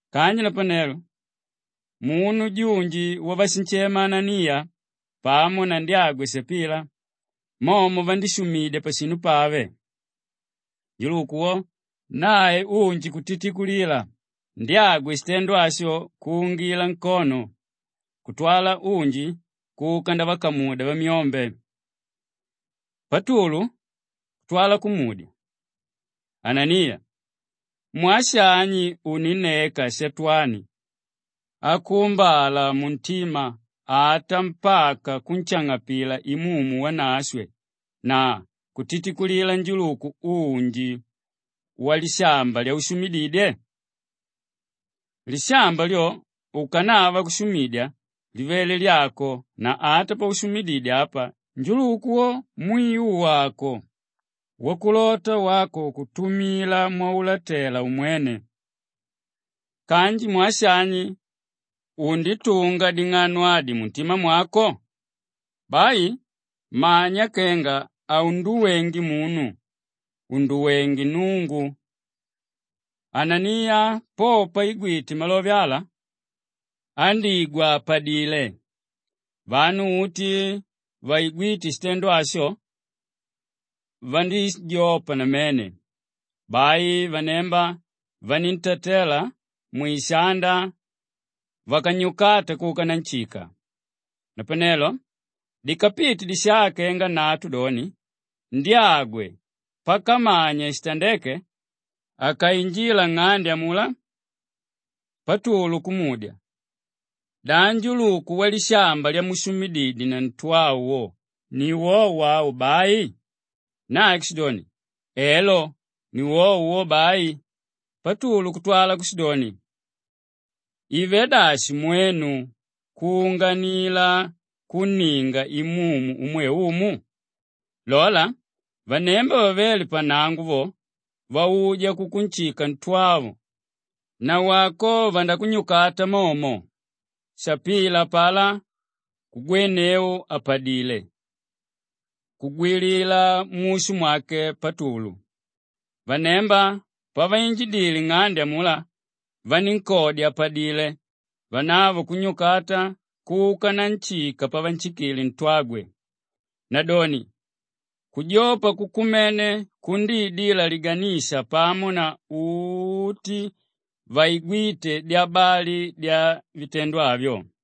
Kanji napanelo, munu junji wavashinshema Ananiya pamo na ndyagwe Shapila, momo vandíshumidya pashinu pave. Njuluku wo nae unji kutitikulila, ndyagwe shitendo asho kuungila nkono kutwala unji kuka ndavakamudya vamyombe. Patulu kutwala kumudya, “Ananiya, mwaa shani uninneka Shatwani akuumbala muntima ata mpaka kunshang'apila Imumu Wanashwe na kutitikulila njuluku unji walishamba lyaushumididye? Lishamba lyo ukanava kushumidya livele lyako na ata paushumididye apa njuluku wo mwiu wàko wakulota wako kutumila mwaulatela umwene. Kanji mwaa shani unditunga ding'ano adi muntima mwako? Bai manya kenga haunduwenge munu, unduwengé Nnungu.” Ananiya po paigwite malove ala, andíjanguka àpadile. Vanu uti vaigwíte shitendo asho vandíjopa namene. Bai vanemba vakantatela mwishanda vakanyukata kuka nanshika. Napanelo dikapite disaa kenga nnatu doni, ndyagwe pakamanya shitandéke akainjila nng'ande amulá, Patulu kumudya, “Da njuluku walishamba lyamushumididye na ntwavo ni wowo au bai?” Nae kushidoni, “Elo, ni wowo wo bai.” Patulu kutwala kushidoni, “Ivelé dashi mwenu kuunganila kunninga Imumu umwe Umu? Lola, vanemba vavéle pannango vo, vauja kukunshika ntwavo, nawako vandakunyukata momo.” Shapila apalá kugwenneu àpadile kugwilila mushu mwake Patulu. Vanemba paviinjidile nng'ande amulá vanínkodya àpadile; vanavo kunnyukata kuka nanshika pavanshikile ntwagwe. Nadoni kujopa kukumene kundiidila liganisha pamo na uti vaigwíte dyabali dyavitendo avyo.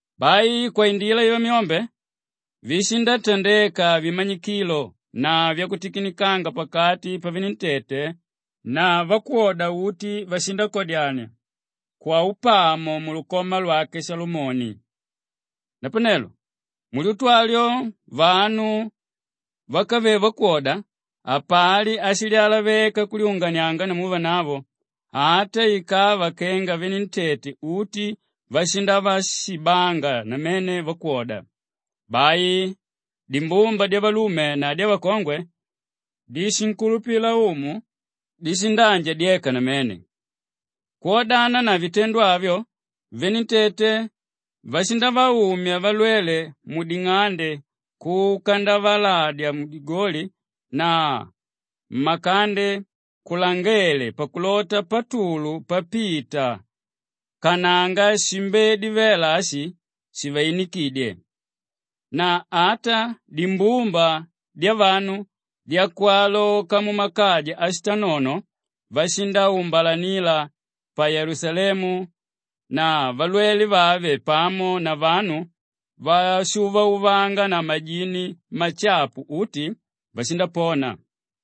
Bai kwaindila yavamyombe, vishindatandeka vimanyikilo na vyakutikinikanga pakati pavenentete na vakwoda uti vashindakadyania kwaunapamo mulukoma lwake Shalomoni. Napanelo mulyutu alyo vanu vákavele vakwoda hapali áshilyalaveka kulyunganianga namu vanavo, ata ikava kenga venentete uti vashindavashibanga namene vakwoda. Bai dimbumba dyavalume na dyavakongwe díshinkulupila Umu dishindaanjadyeka namene. Kwodana na vitendo avyo, venentete vashindavaumya valwele muding'ande kuka ndavaladya mudigoli na mmakande kulangele pakulota Patulu papita kananga shimbedi vela ashi shiviinikidye. Na ata dimbumba dyavanu dyakwaloka mumakaja ashitanono, vashindaumbalanila pa Yelusalemu na valwelwe vave pamo na vanu váshuuvauvanga na majini mashapu uti vashindapona.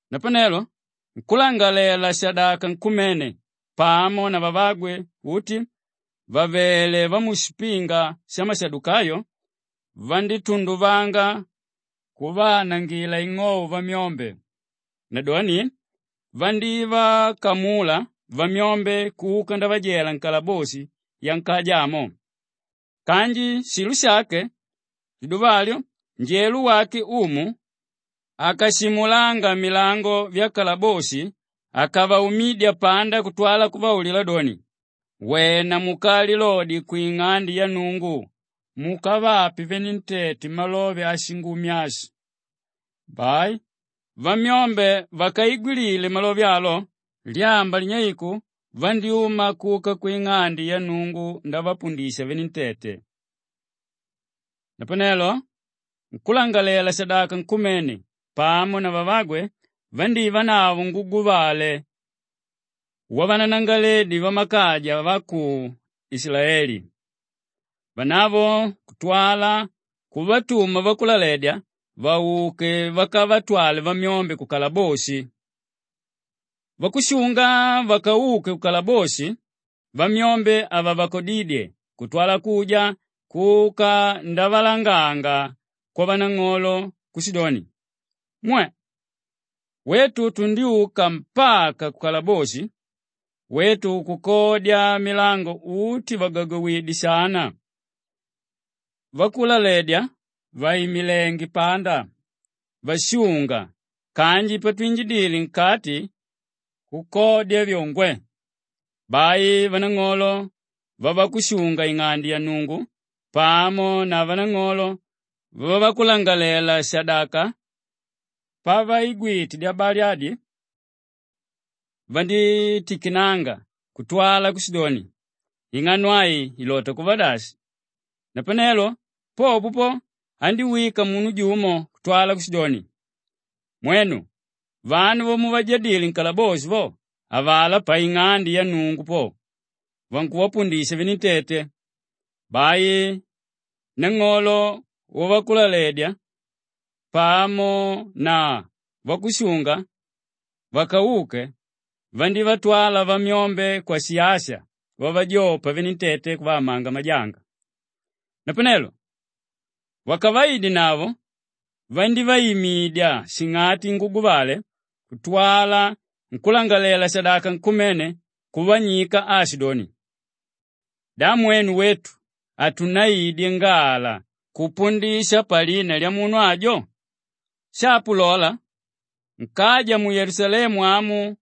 Napanelo nkúlangalalela-shadaka nkumene pamo na vavagwe uti vàvele vamushipinga shamashadukayo, vandítunduvanga kuvaanangila ing'ou vamyombe. Nadoni vandívakamula vamyombe kuka ndavajela nkalaboshi yankaja amo. Kanji shilo shake liduva alyo njelo wake Umu akashimulanga milango vyakalaboshi, akavaumidya panda kutwala kuvaulila doni, “Wena mukalilodye kwing'ande ya Nnungu mukavape venentete malove a Shingumi ashi.” Bai vamyombe vakaigwilile malove alo; lyamba linyeiku vandyúma kuka kwing'ande ya Nnungu ndavapundisha venentete. Napanelo nkúlangalalela-shadaka nkumene pamo na vavagwe vandívanavo nguguvale wavananangalaledi vamakaja va ku Ishilaeli. Vanavo kutwala kuvatuma vakulaledya vauke vakavatwale vamyombe kukalaboshi. Vakushunga vakauke kukalaboshi, vamyombe havavakodidye kutwala kuja kuka ndavalanganga kwavanang'olo kushidoni, “Mwe! Wetu tundyuka mpaka kukalaboshi; wetu kukodya milango uti vàgagowidye shana, vakulaledya vàimilenge panda vashunga kanji patushimwile, nkati kukodya vyo, ngwe!” Bai nang'olo wavakushunga-ing'ande ya Nnungu pamo na vanang'olo vavakulangalalela-shadaka pavaigwite dyabali adi vandítikinanga kutwala kushidoni, “Ing'ano ai ilota kuva dashi!” Napanelo popo po, andíwika munu jumo kutwala kushidoni, “Mwenu, vanu vamuvajadile nkalaboshi vo, avalá paing'ande ya Nnungu po, vankuvapundisha venentete.” Bai nang'olo wavakulaledya pamo na vakushunga vakauke vandívatwala vamyombe kwasiyasa vavajopa venentete kuvaamanga majanga. Napanelo vakavaidenavo vandívaimidya shing'ati nguguvale kutwala nkúlangalalela-shadaka nkumene kuvanyika aashidoni, “Da mwenu wetu hatunnaidye ngala kupundisha palina lyamunu ajo? Shapo lola, nkaja mu Yelusalemu amu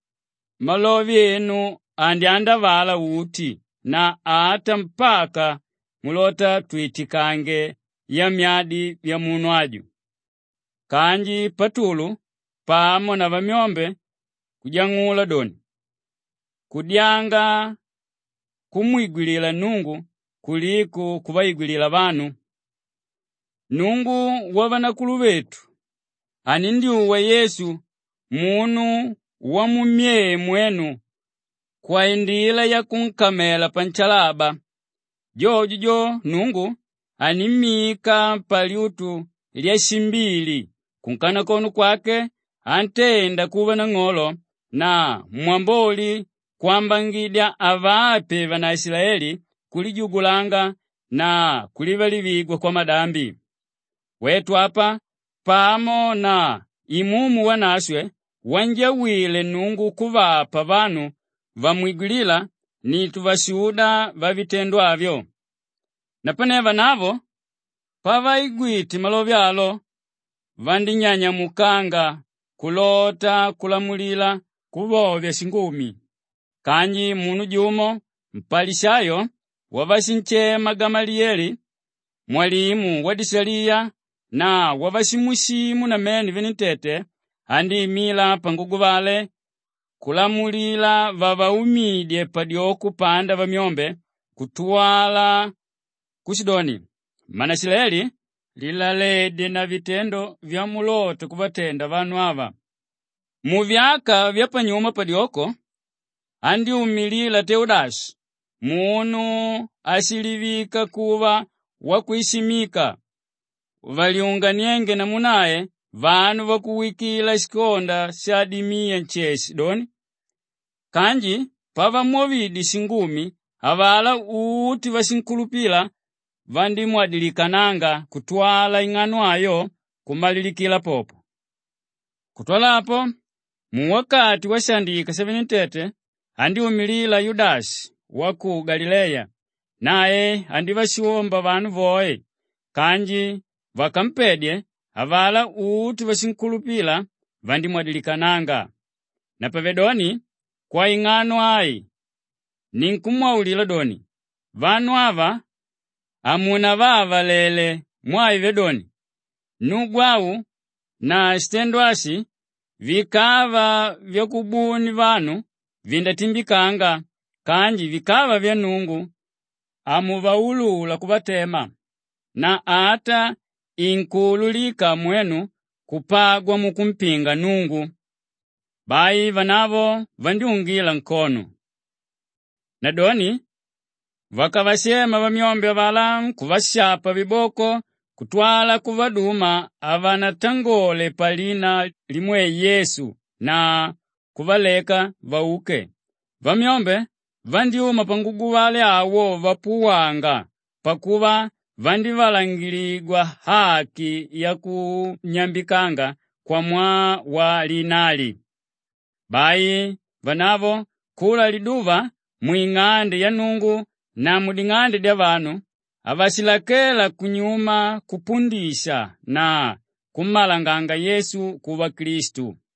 malove enu andyaandavala uti na ata mpaka mulota twitikange yamyadi vyamunu aju.” Kanji Patulu pamo na vamyombe kujang'ula doni, “Kudyanga kumwigwilila Nnungu kuliko kuvaigwilila vanu. Nnungu wavanakuluvetu anindyuwa Yesu, munu wamummyee mwenu kwaindila yakunkamela panshalaba. Jojo jo, Nnungu animmika palyutu lyashimbili kunkanakono kwake antenda kuva Nang'olo na Mwamboli kwambangidya avape vanaishilaeli kulijugulanga na kulivalivigwa kwamadambi. Wetu apa pamo na Imumu Wanashwe wanjawile Nnungu kuvapa vanu vamwigwilíla ni tuvashuda vavitendo avyo.” Napane vanavo pavaigwite malove alo, vandínyanyamukanga kulota kulamulila kuvovya shingumi. Kanji munu jumo mpalishayo wavashinshema Gamaliyele mwalimu wadishaliya na wavashimwishimu namene venentete, andíimila panguguvale kulamulila vavaumidye padyoko panda vamyombe kutwala kushidoni, “Mmanaishilaeli! Lilaledye na vitendo vyamulota kuvatenda vanu ava. Muvyaka vyapanyuma padyoko, andyúmilila Teudashi munu áshilivika kuva wakwishimika; vandílyunganianga namu nae vanu vakuwikila shikonda kenga shadimiya nsheshe doni. Kanji pavamwovidye shingumi, avalá uti váshinkulupila vandímwadilikananga kutwala ing'ano ayo kumalilikila popo. Kutwala apo, muwakati washaandika shavenentete andyúmilila Yudashi wa ku Galileya; nae andívashomba vanu voe kanji vakampedye, avalá uti váshinkulupila vandíjaikananga. Napavedoni kwaing'ano ai ninkumwaulila doni, vanu ava hamunavaavalele mwaa ivelé doni, nnugu au na shitendo ashi vikava vyakubuni vanu, vindatimbikanga kanji vikava vya Nnungu hamuvaulula kuvatema na ata inkuululika mwenu kupagwa mukumpinga Nnungu.” Bai vanavo vandyúngila nkono. Nadoni vakavashema vamyombe avalá vakavashapa viboko kutwala kuvaduma havanatangole palina limwe Yesu na kuvaleka vauke. Vamyombe vandyúma panguguvale awo vapuwanga pakuva vandivalangiligwa aki yakunyambikanga kwamwaa wa Lina ali. Bai vanavo kula liduva mwing'ande ya Nnungu na muding'ande dyavanu, havashilakela kunyuma kupundisha na kummalanganga Yesu kuva Klistu.